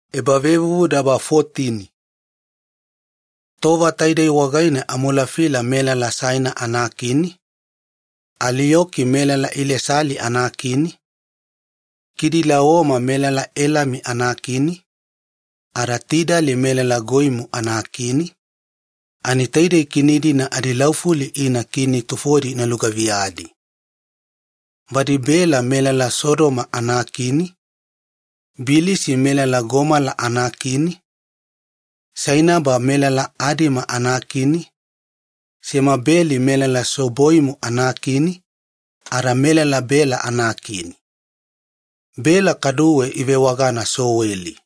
Ebelamo Lota giyavana. Tova taidei wagaine Amolafila melala Saina anakini, Aliyoki melala Ilesali anakini, Kidolaoma melala Elami anakini, ada Tidali melala Goiimu anakini, taidei kini-dina adilaufuli ina kini tufona ina lugaviyadi. Badi Bela melala Sodoma anakini, Bilisa melala Gomola anakini, Sainaba melala Adima anakini, Semebeli melala Seboiimu anakini ada melala Bela anakini. Bela kaduwe ivewagana Soweli.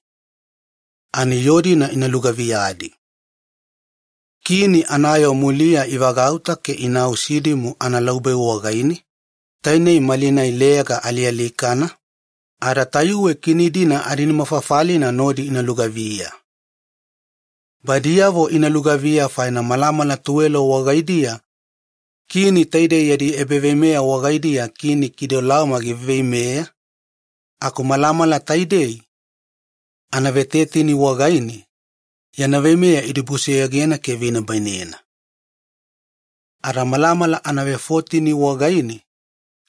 Ani yoo-dina ina lugaviyadi. Kini anayoo muliya ivagauta ke inau Sidimu ana Laubeu wagaine, tainei malinai 'Leyaga Alialikana', ada tayuwe kini-dina adinimafafalina nodi ina lugaviya. Badiyavi ina lugaviya faina malamala tuwelo wagaidiya kini taidei yadi ebaveimeya wagaidiya Kini Kidolaoma giveiveimeya, aku malamala taidei, anavetetini wagaine, yana veimeya idibusoyogena ke ivenibainena. Ada malamala anavefotini wagaine,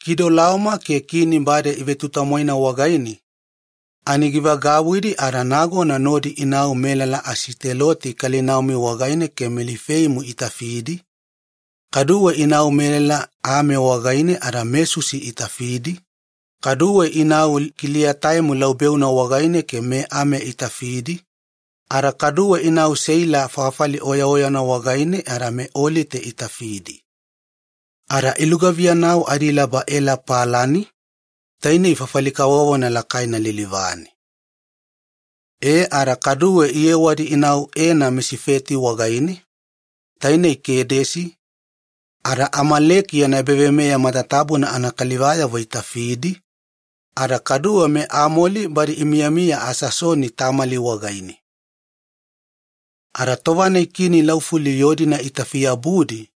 Kidolaoma ke kini bade ivetutamwaina wagaine ani givagauwidi ada nagona nodi inau melala Asiteloti Kalinaimu wagaine ke meLifeimu itafidi, kaduwe inau melala Ame wagaine ada meSusi itafidi, kaduwe inau Kiliataimu Laubeuna wagaine ke meAme itafidi, ada kaduwe inau Seila fafali oyaoyana wagaine ada meOliti itafidi ada ilugaviyanau adilaba Ela Palani, tainei makama kavovona lakaina lilivane. E ada kaduwe iyewadi inau Ena Misifeti wagaine, tainei Kedesi, ada Amaleki yana ebaveimeya matatabuna anakalivayavo itafidi, ada kaduwe meAmoliti badi imiyamiya Asasoni Tamali wagaine. Ada tova-nai kini laufuli itafiyabudi yoo-dina,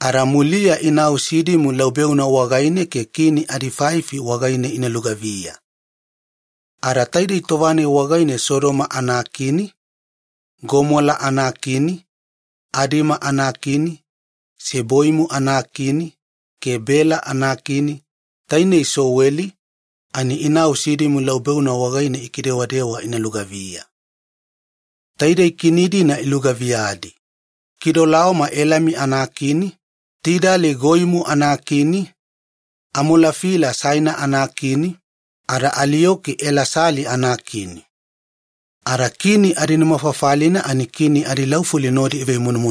ada muliya inau Sidimu Laubeuna wagaine, ke kini nimafafalina wagaine ina lugaviya. Ada taidei tova-nai wagaine Sodoma anakini, Gomola anakini, Adima anakini, Seboiimu anakini ke Bela anakini, tainei Soweli, ani inau Sidimu Laubeuna wagaine ikidewadewa ina lugaviya, taidei kini-dina nodi, Kidolaoma Elami anakini, Tidali Goiimu anakini, Amolafila Saina anakini ada Alioki Elasali anakini. Ada kini adinimafafalina iveimunumunuga kini adilaufuli nodi.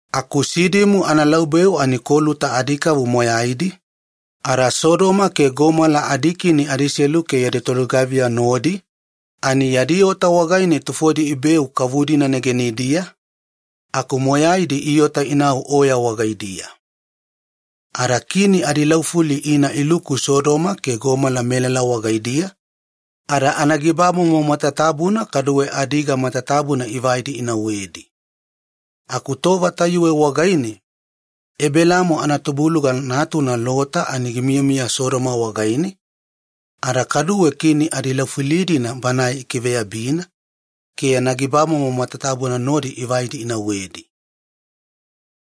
Aku Sidimu ana Laubeu ani koluta adikavu moyaidi, ada Sodoma ke Gomola adikini adiselu ke yadi tolugaviya nodi yadi ota wagaine tufodi ibeu kavu-dina negenidiya aku moyaidi iota inau oya wagaidiya. Ada kini adilaufuli ina iluku Sodoma ke Gomola melala wagaidiya ada anagibamomo matatabuna kaduwe adiga matatabuna ivaidi inauwedi. Aku tova tayuwe wagaine Ebelamo tubuiyana natuna Lota ani gimiyamiya Sodoma, ada kaduwe banae ikiveyabina ke yana gibamomo matatabuna nodi ivaidi inauwedi.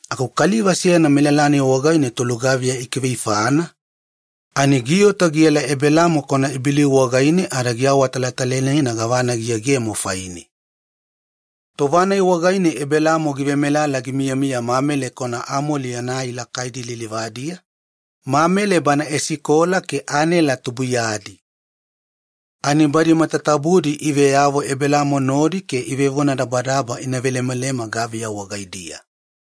Aku kaliva seyana melala-nai wagaine tolugaviya ikiveifana ani giota giela Ebelamo kwanaIbeliu wagaine ada giawatalatalainena gavana giyegemo faine. Tova-nai wagaine Ebelamo givemelala gimiyamiya Mamele kwanaAmon yana ai lakaidi lilivadiya, Mamele bana Esikola ke Anela tubuiyadi. Ani badi matatabudi iveyavo Ebelamo nodi ke ivevonadabadaba ina velemalema gaviya wagaidiya.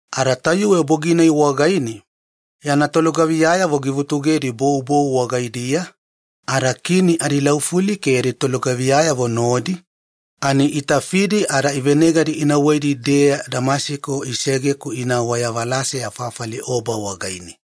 Ada tayuwe bogi-nai wagaine yana tolugaviyavo givutugedi bou bou wagaidiya ada kini adilaufuli ke yadi tolugaviyayavo nodi itafidi ada ivenegadi inauwedi-deya Damasiko isege-ku inau wayavalaseya fafali Oba wagaine.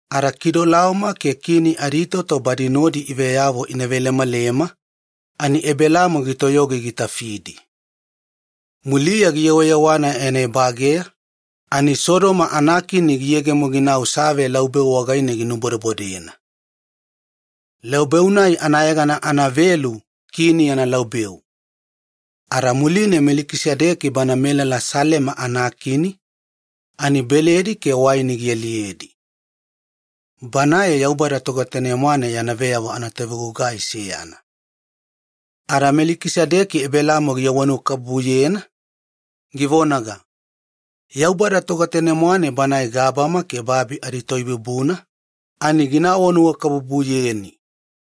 Ada Kidolaoma ke kini aditoto bana nodi iveyavo ina velemalema ani Ebelamo gitoyogi gitafidi. Muliya giyewayewana yana ebageya ani Sodoma anakini giyegemo ginau Save Laubeu wagaine ginubodebodena. Laubeu-nai anayegana anavelu ‘Kini Yana Laubeu’. Ada muline Melekisedeki melala Salema anakini ani beledi ke waini gialiyedi. Banae Yaubada Togetane-mwane yana tovebolavoi. Melakisedeki Ebelamo givonanuwakabubuyena, givonaga, “Yaubada Togetane-mwane, Banae gabama ke babi adiToibubuna ani meyameyaganina gina vonanuwakabubuyeni.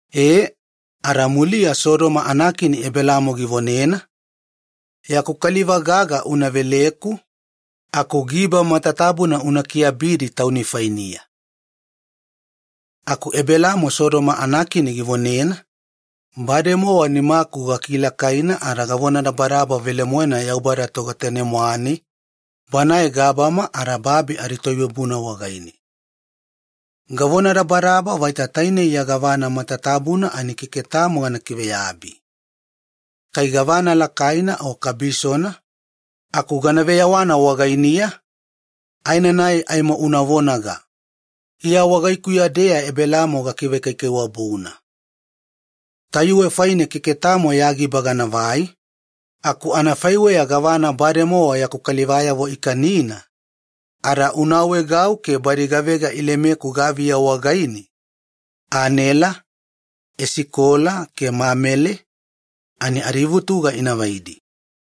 E, ada muliya Sodoma anakini Ebelamo givonena, “Kaliva gaga una veleku aku giba matatabuna una kiabidi tauni fainiya.” Aku Ebelamo Sodoma anakini givonena, “Bademowa nimaku gakilakaina ada gavonadabadaba velemoena Yaubada Togetane-mwane, Banae gabama ada babi adiToibubuna wagaine. Gavonadabadaba vaita tainei ya gavana matatabuna aimo keke tamo gana kiveyabi, kai gavana lakaina o kabisona aku aimo gana veyewana wagainiya, aenanai aimo una vonaga, ‘Iya wagaikuya-deya Ebelamo gakivekaikaiwabuna’. Tayuwe faine keke tamo ya giba ganavai, aku anafaiweya gavana bademowa yaku kalivayavo ikanina, ada una awaegau ke badi gavega ilemeku gaviya wagaine, Anela, Esikola ke Amon ani adivutuga inavaidi.”